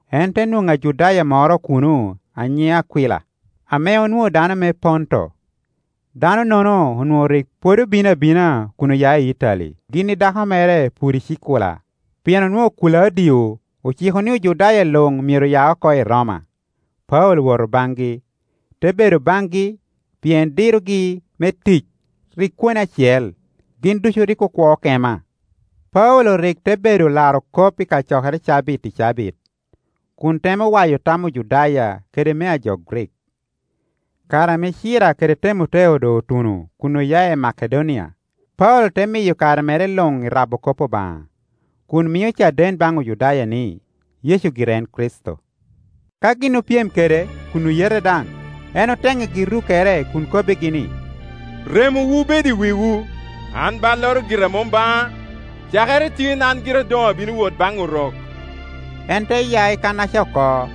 En te nwoŋo Ajudaya moro kuno a nyiŋe Akwila, ame onwoŋo dano me Ponto. Dano-nono onwoŋo rik pwod obino abina kun oya i Itali gin i dako mere Puricikula, pien onwoŋo Kulaudio ociko ni Ojudaya luŋ myero ya oko i Roma. Paulo owoto baŋgi, te bedo baŋgi, pien dirogi me tic rik kwone acel; gin ducu rik okwo kema. Paulo rik te bedo laro kop i kacokere cabit i cabit, kun temo wa yo tam Ojudaya kede mea jo Grik. Kare ame Cira kede Temoteo doŋ otuno kun oya i Makedonia, Paulo te miyo kare mere luŋ i rabo kop Obaŋa, kun mio caden baŋ Ojudaya ni, Yecu gire en Kricito. Ka gin opyem kede kun oyete daŋ, en otennigi rukkere kun kobbigi ni, “Remowu bed i wiwu! An balloro gira mom baŋa. Cakere tin an gira doŋ abino wot baŋ Orok.” En te ya i kannaca oko,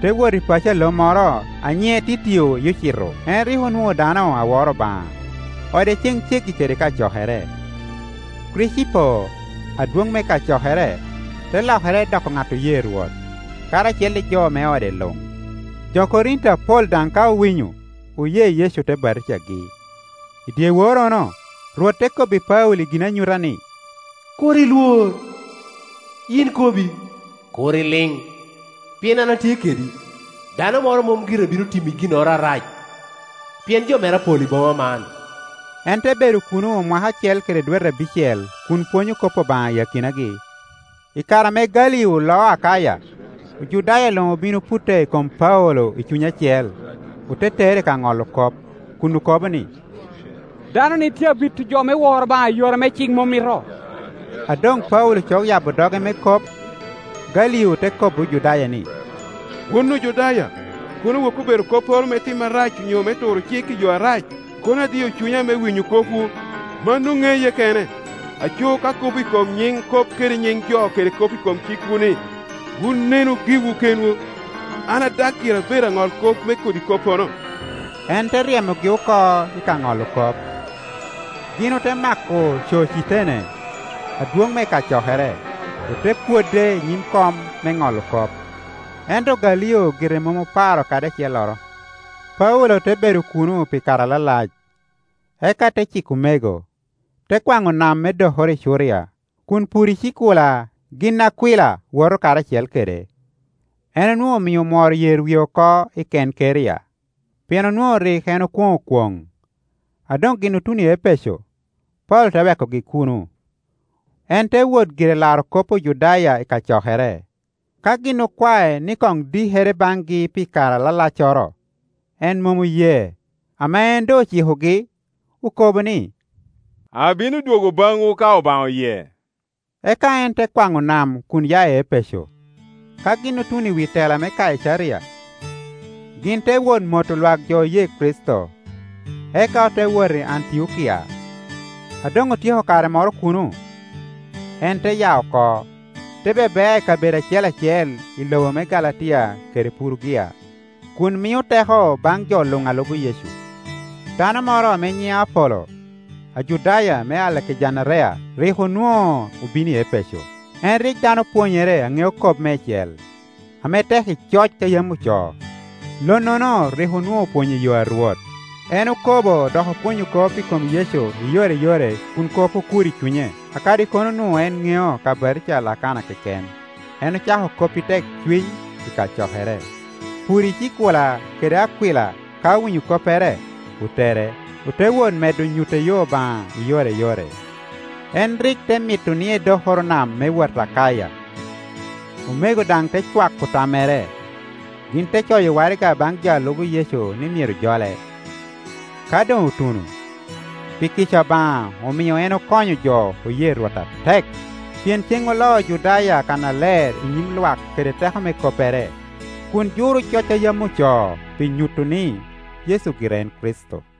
te wot i paco a lo moro a nyiŋe Titio Yucito; en rik onwoŋo dano a woro Obaŋa, ode ceŋ ceggi kede kacokere. Kricipo, adwoŋ me kacokere, te lokere doko ŋat oye Rwot, karacel i jo me ode luŋ; jo Korinti apol daŋ ka owinyo, oye Yecu ote batijagi. I dyeworrono, Rwot te kobbi Paulo i ginanyuta ni, “Kur ilwor; yin kobbi, kur iliŋ; pien an atye kedi. Dano moro mom gire bino timi i ginnoro arac, pien jo mera pol i boma man.” En te bedo kuno mwaka acel kede dwete abicel kun pwonyo kop Obaŋa i akinagi. I kare ame Galio loo Akaya, Ojudaya luŋ obin oputte i kom Paulo i cuny acel, ote tere i ka ŋolo kop, kun okobo ni, “Dano-ni tye abito jo me woro Obaŋa i yore ame cik mom mito.” A doŋ Paulo cok yabo doge me kop, Galio te kobbi Ojudaya ni, “Wun Ojudaya, kono woki obedo kopporo me tim arac onyo me turo cik i yo arac, kono adio cunya me winyo kopwu, mano ŋeye kene. Aco ka kop i kom nyiŋ kop kede nyiŋ jo kede kop i kom eikwu-ni, wun nenu giwu keŋwu; an adag gira bedo aŋolkop me kodi koppono.” En te ryemogi oko ika ŋolo kop. Gin ote mako Cocitene, adwoŋ me kacokere, ote pwode inyim kom me ŋolo kop; ento Galio gire mom oparo kadi acelloro. Paulo te bedo kuno pi kare alalac, eka te ciko omego, te kwaŋo nam me dokoro i Curia, kun Puricikula gin i Akwila woto karacel kede. En onwoŋo omio omworo yer wie oko i Kenkeria, pien onwoŋo rik en okwoŋo kwoŋ. A doŋ gin otuno i Epeco, Paulo te wekogi kuno, en te wot gire laro kop Ojudaya i kacokere. Ka gin okwae ni koŋ dikere baŋgi pi kare alalaccoro, en mom oye. Ame en doŋ ocikogi, okobo ni, “Abino dwogo baŋwu ka Obaŋa oye.” Eka en te kwaŋo nam kun ya i Epeco. Ka gin otuno i wi tela me Kaicaria, gin te wot moto lwak jo oye Kricito, eka ote wot i Antiokia. A doŋ otyeko kare moro kuno, en te ya oko, te bebea i kabedo acel acel i lobo me Galatia kede Purugia, kun mio teko baŋ jo luŋ a lubo Yecu. Dano moro ame nyiŋe Apolo, Ajudaya me Alegejanderia; rik onwoŋo obino i Epeco. En rik dano opwonyere a ŋeo kop meicel, ame tek i coc a yam ocoo. Lonnono rik onwoŋo opwonyo i yo a Rwot; en okobo dok opwonyo kop i kom Yecu i yore i yore kun kop okur i cunye, kadi kono onwoŋo en ŋeo ka batija a Lakana keken. En ocako kop i tekcuny i kacokere. Puricikula kede Akwila ka owinyo koppere, otere, ote wot medo nyutte yo Obaŋa i yore i yore. En rik te mito ni edokoro nam me wot Akaya, omego daŋ te cwako tammere, gin te coyo waraga baŋ jo a lubo Yecu ni myero jole. Ka doŋ otuno, pi kica Obaŋa omio en okonyo jo oye Rwot atek, pien cen oloyo Ojudaya kannaler i nyim lwak kede teko me koppere, kun juro coc a yam ocoo pi nyuto ni, Yecu gire en Kricito.